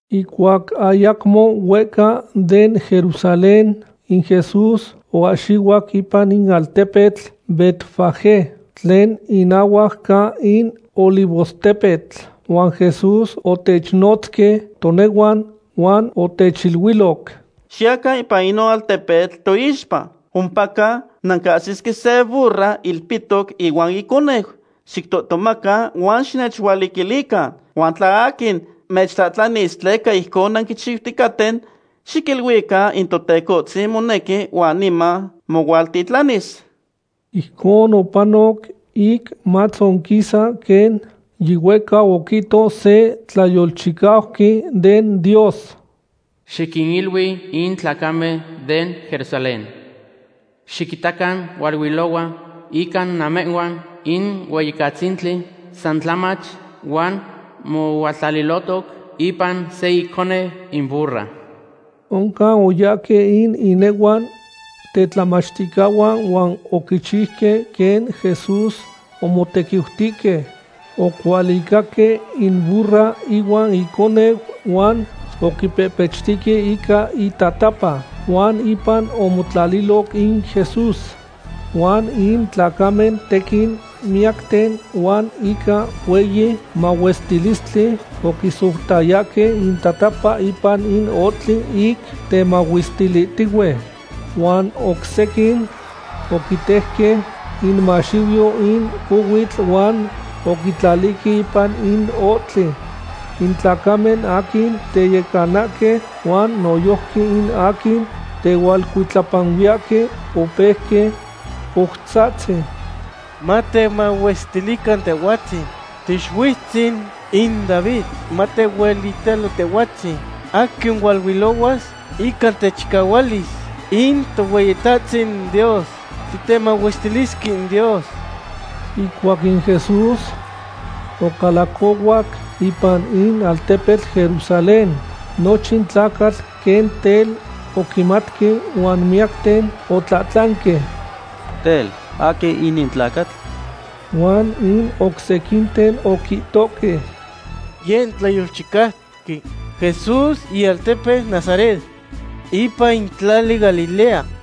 Ihcuac ayacmo huehca den Jerusalén, in Jesús oahxihuac ipan in altepetl Betfagé, tlen inahuac ca in Olivostepetl, huan Jesús otechnotzque tonehuan, huan otechiluiloc: ―Xiyacan ipan inon altepetl toixpa. Ompa nancahsisque se burra ilpihtoc ihuan iconeu. Xictohtomacan huan xinechualiquilican. Huan tla aquin mechtlahtlanis tleca ijcon nanquichiuticaten, xiquiluican in Totecohtzin monequi huan niman mohualtitlanis. Ijcon opanoc ic matzonquisa quen yihuehcau oquihto se tlayolchicauqui den Dios: Xiquinilui in tlacamen den Jerusalén: “Xiquitacan hualuilohua ica namehhuan in Hueyicatzintli, san tlamach, huan mohualtlalilohtoc ipan se iconeu in burra.” Oncan oyahque in inehuan tetlamachticahuan huan oquichiuque quen Jesús omotequiutihque. Ocualicahque in burra ihuan iconeu huan oquipehpechtihque ica intatapa, huan ipan omotlaliloc in Jesús. Huan in tlacamen tequin miyacten huan ica hueyi mahuestilistli oquisoutayahque intatapa ipan in ohtli ic temahuestilihtihue. Huan oc sequin oquitejque inmaxiuyo in cohuitl huan oquitlalihque ipan in ohtli. In tlacamen aquin teyecanahque huan noyojqui in aquin tehualcuitlapanuiyahque opeuque coutzahtzi: ―¡Matemahuestilican Tehhuatzin Tiixuiutzin in David! ¡Matehuelitalo Tehhuatzin aquin hualuilohuas ica in techichualis in Tohueyitahtzin Dios! ¡Titemahuestilisque in Dios! Ihcuac in Jesús ocalacohuac ipan in altepetl Jerusalén, nochin tlacatl quen tel oquimatque huan miyacten otlahtlanque: ―Tel, ¿aquin inin tlacatl? Huan in oc sequinten oquihtohque: ―Yeh in tlayolchicauqui Jesús ialtepeu Nazaret, ipan in tlali Galilea.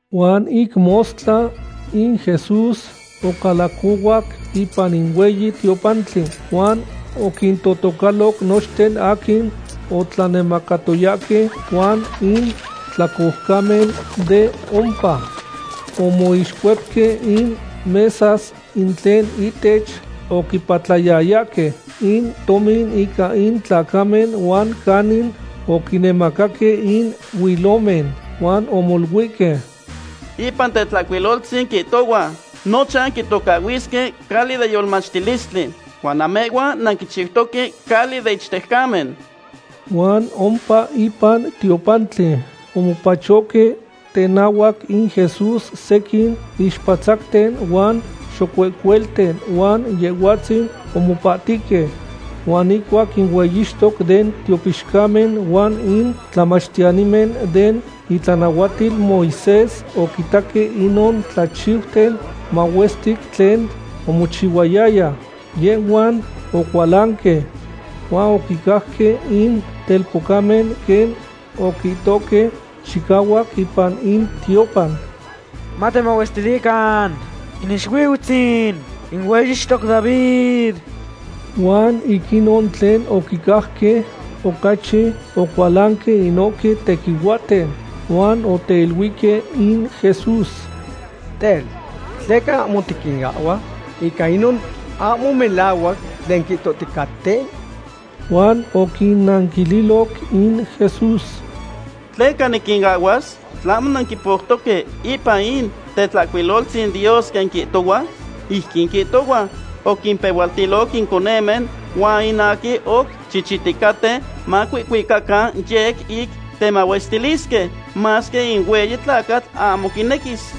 Huan ic mostla, in Jesús ocalacohuac ipan in hueyi tiopantli huan oquintotocaloc nochten aquin otlanemacatoyahque huan in tlacoucamen de ompa. Omoixcuepque in mesas in tlen ihtech oquipatlayayahque in tomin ica in tlacamen huan canin oquinemacaque in huilomen, huan omoluihque: ―Ipan in Tetlahcuiloltzin quihtohua: “Nochan quitocahhuisque cali den yolmachtilistli”; huan namehhuan nanquichiutoque cali den ichtejcamen. Huan ompa ipan tiopantli omopachohque tenahuac in Jesús sequin ixpatzacten huan xocuehcuelten huan Yehhuatzin omopahtihque. Huan ihcuac in hueyixtoque den tiopixcamen huan in tlamachtiyanimen den itlanahuatil Moisés oquitaque inon tlachiuten mahuestic tlen omochihuayaya, yehhuan ocualanque. Huan oquicajque in telpocamen quen oquihtohque chicahuac ipan in tiopan: “¡Matemahuestilican in Ixuiutzin in hueyixtoc David!” Huan ic inon tlen oquicajque, ocachi ocualanque inohque tequihuahten. Huan oteiluihque in Jesús: ―Tel, ¿tleca ahmo tiquinahhua ica inon ahmo melahuac tlen quihtohticaten? Huan oquinnanquililoc in Jesús: ―¿Tleca niquinahhuas? ¿Tlahmo nanquipoutoque ipan in Tetlahcuiloltzin Dios quen quihtohua? Ijquin quihtohua: Oquimpehualtiloc in coconen huan in aquin oc chichihticaten macuihcuicacan yec ic temahuestiliyahque, masque in hueyi tlacatl ahmo quinequis.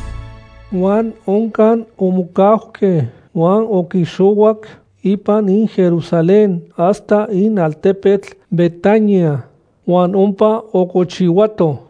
Huan oncan omocauque, huan oquixohuac ipan in Jerusalén hasta in altepetl Betania, huan ompa ocochihuato.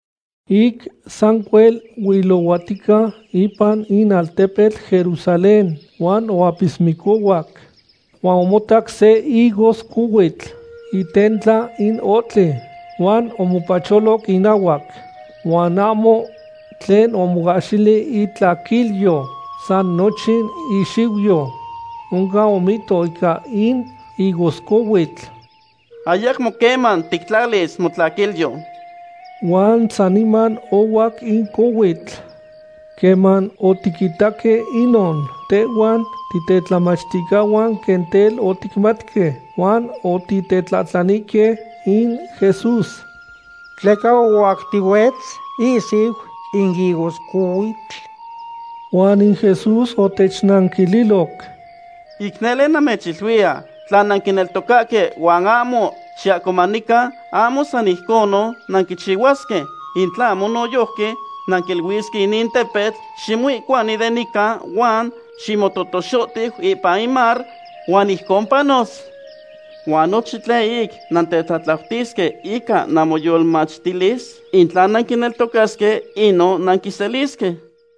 Ic sancuel huilohuatica ipan in altepetl Jerusalén, huan oapismicohuac. Huan omotac se higoscohuitl itentla in ohtli, huan omopacholoc inahuac. Huan ahmo tlen omoahxili itlaquilyo, san nochin ixiuyo. Oncan omihto ica in higoscohuitl: ―¡Ayacmo queman tictlalis motlaquilyo! Huan saniman ohuac in cohuitl. Queman otiquitaque inon, tehhuan titetlamachticahuan quen tel oticmatque, huan otitetlahtlanihque in Jesús: ―¿Tleca ohuactihuitz ihsiu in higoscohuitl? Huan in Jesús otechnanquililoc: ―Ic nele namechiluiya, tla nanquineltocahque huan ahmo xiahcomanican, ahmo san ijcon nanquichihuasque, in tlahmo noyojqui nanquiluisque inin tepetl: “Ximoihcuani de nican, huan ximototoxohtiu ipan in mar”, huan ijcon panos. Huan nochin tlen ic nantetlatlautisque ica namoyolmachtilis, in tla nanquineltocasque, inon nanquiselisque.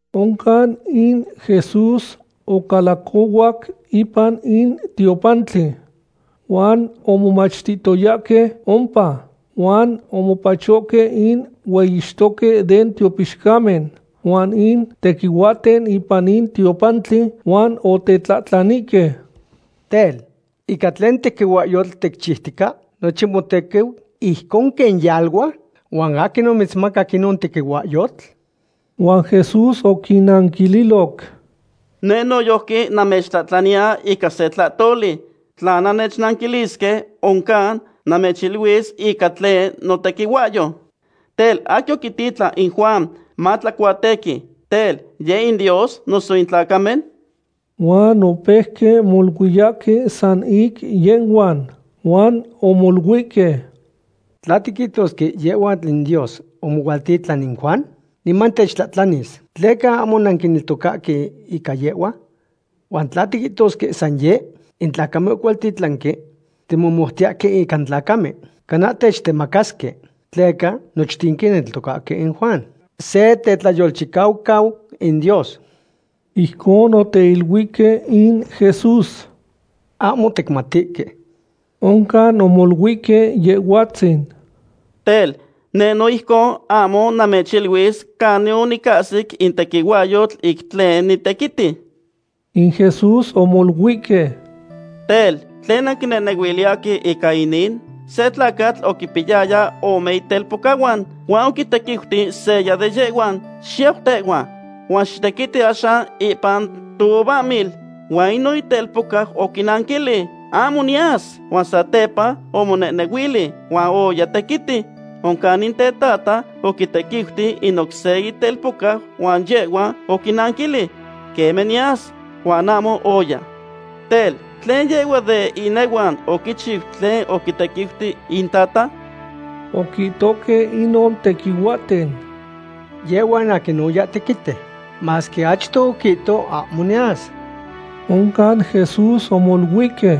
Oncan in Jesús ocalacohuac ipan in tiopantli huan omomachtihtoyahque ompa. Huan omopachohque in hueyixtoque den tiopixcamen huan in tequihuahten ipan in tiopantli, huan otetlahtlanihque: ―Tel, ¿ica tlen tequihuahyotl ticchiutica nochin motequiu ijcon quen yalua, huan aquin omitzmacac inon tequihuahyotl? Huan Jesús oquinnanquililoc: ―Neh noyojqui namechtlahtlani ica se tlahtoli. Tla nannechnanquilisque, oncan namechiluis ica tlen notequihuahyou. Tel, ¿aquin oquititlan in Juan matlacuatequi? Tel, ¿yeh in Dios noso in tlacamen? Huan opeuque moluiyahque san ic yehhuan, huan omoluihque: ―Tla tiquihtosque yehhua in Dios omohualtitlan in Juan, niman techtlahtlanis, “¿Tleca ahmo nanquineltocahque ica yehhua?” Huan tla tiquihtosque san yeh in tlacamen ocualtitlanque, timomoutiyahque ica in tlacamen, cana techtemacasque, tleca nochten quineltocahque in Juan se tetlayolchicaucau in Dios. Ijcon oteiluihque in Jesús: ―Ahmo ticmatihque. Oncan omoluihque Yehhuatzin: ―Tel, neh no ijcon ahmo namechiluis canin onicahsi in tequihuahyotl ic tlen nitequiti. In Jesús omoluihque: ―Tel, ¿tlen nanquinehnehuiliyahque ica inin? Se tlacatl oquipiyaya ome itelpocahuan, huan oquitequiuti seya de yehhuan: “Xiyau tehhua, huan xitequiti axan ipan touvahmil.” Huan inon itelpocau oquinanquilic: “¡Ahmo niyas!” Huan satepa omonehnehuili, huan oya tequiti. Oncan in tetata oquitequiuti in oc se itelpocau huan yehhua oquinanquilic: “Queme, niyas.” Huan ahmo oya. Tel, ¿tlen yehhua den inehuan oquichiu tlen oquintequiuti intata? Oquihtohque inon tequihuahten: ―Yehhua in aquin oya tequiti, masque achto oquihto ahmo yas. Oncan Jesús omoluihque: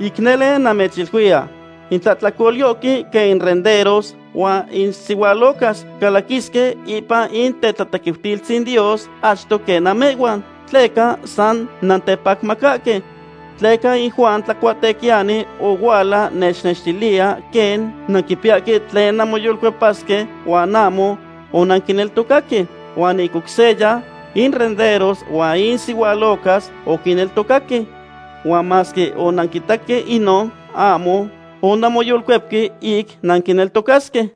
―Ic nele namechiluiya, in tlahtlacolyohque quen in renderos huan in sihualocas calaquisque ipan in tetlatequiutilistzin Dios achto quen namehhuan, tleca san nantepacmacahque. Tleca in Juan Tlacuatequiyani ohuala mechnextiliya quen nanquipiyahque tlen nanmoyolcuepasque huan ahmo onanquineltocaque. Huan ic oc seya, in renderos huan in sihualocas oquineltocaque. Huan masque onanquitaque inon, ahmo onanmoyolcuepque ic nanquineltocasque.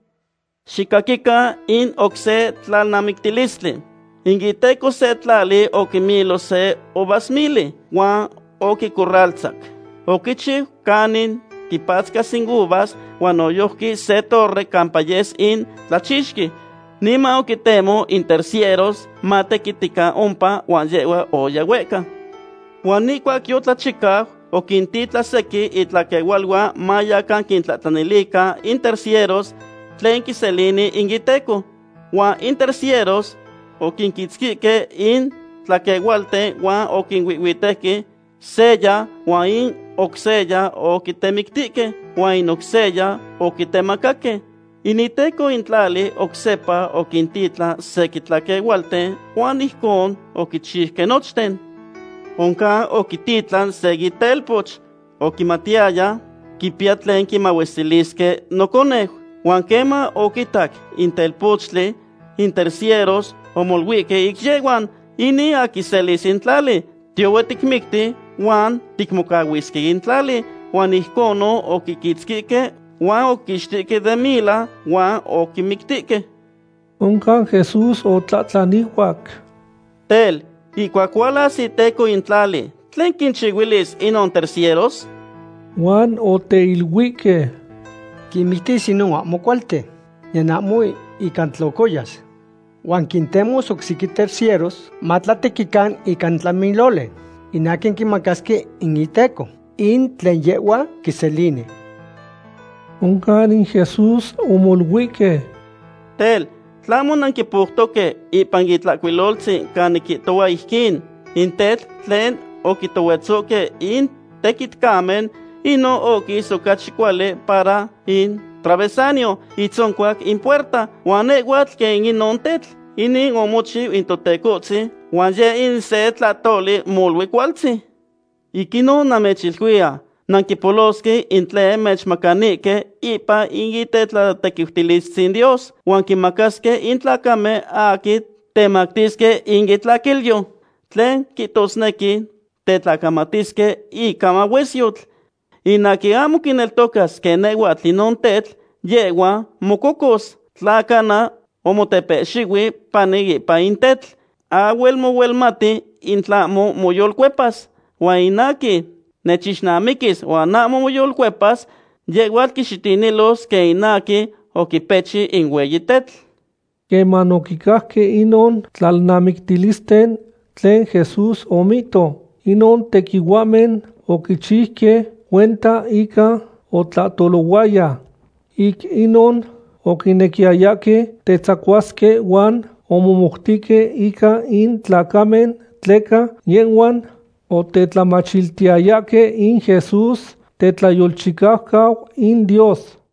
’Xicaquican in oc se tlalnamictilistli. In iteco se tlali oquimilo se uvasmili, huan oquicorraltzac. Oquichihchiu canin quipatzcasque in uvas, huan noyojqui se torre campa yes in tlachixqui. ’Niman oquintemo in tercieros matequitican ompa, huan yehhua oya huehca. Huan ihcuac yotlachicau, oquintitlan sequin itlaquehualuan mayacan quintlahtlanilican in tercieros tlen quiselini in iteco. Huan in tercieros oquinquitzquihque in tlaquehualten huan oquihuihhuitejque seya, huan in oc seya oquitemictihque, huan in oc seya oquitemacaque. In iteco in tlali oc sepa oquintitlan sequin tlaquehualten huan ijcon oquinchiuque nochten. ’Oncan oquititlan se itelpoch. Oquimatiyaya: “Quipiya tlen quimahuestilisque noconeu.” Huan queman oquitaque in telpochtli, in tercieros omoluihque ic yehhuan: “Inin aquin quiselis in tlali. Tiyohue ticmicti huan ticmocahuisque in tlali.” Huan ijconon oquiquitzquihque huan oquiquixtihque den mila huan oquimictihque. Oncan Jesús otlahtlanihuac: ―Tel, ¿ihcuac hualas iteco in tlali, tlen quinchihuilis inon tercieros? Huan oteiluihque: ―Quinmictis inon ahmo cualten, niyan ahmo inca tlocoyas. Huan quintemos oc sequin tercieros matlatequican ica in tlamiloli, in aquin quimacasque in iteco in tlen yehhua quiselini. Oncan in Jesús omoluihque: ―Tel, tlahmo nanquipoutoque ipan in Itlahcuilotzin canin quihtohua ijquin: In tetl tlen oquitohuetzohque in tequitcamen, inon oquis ocachi cuali para in travesaño itzoncuac in puerta. Huan nehhuatl quen inon tetl. Inin omochiu in Totecohtzin huan yeh in se tlahtoli molui cualtzin. Ic inon namechiluiya, nanquipolosque in tlen mechmacanihque ipan in tetlatequiutilistzin Dios, huan quinmacasque in tlacamen aquin temactisque in itlaquilyo, tlen quihtosnequi tetlacamatisque ica mahuesyotl. In aquin ahmo quineltocas quen nehhuatl inon tetl, yehhua mococos, tla cana omotepehxihui pani ipan in tetl. Ahhuel mohuelmati in tlahmo moyolcuepas. Huan in aquin nechixnamiquis huan ahmo moyolcuepas, yehhuatl quixitinilos quen in aquin oquipechi in hueyi tetl. Queman oquicajque inon tlalnamictilisten tlen Jesús omihto, inon tequihuahmen oquichiuque cuenta inca otlahtolohuaya. Ic inon oquinequiyayahque tetzacuasque huan omomoutihque ica in tlacamen tleca yehhuan otetlamachiliyayahque in Jesús tetlayolchicaucau in Dios.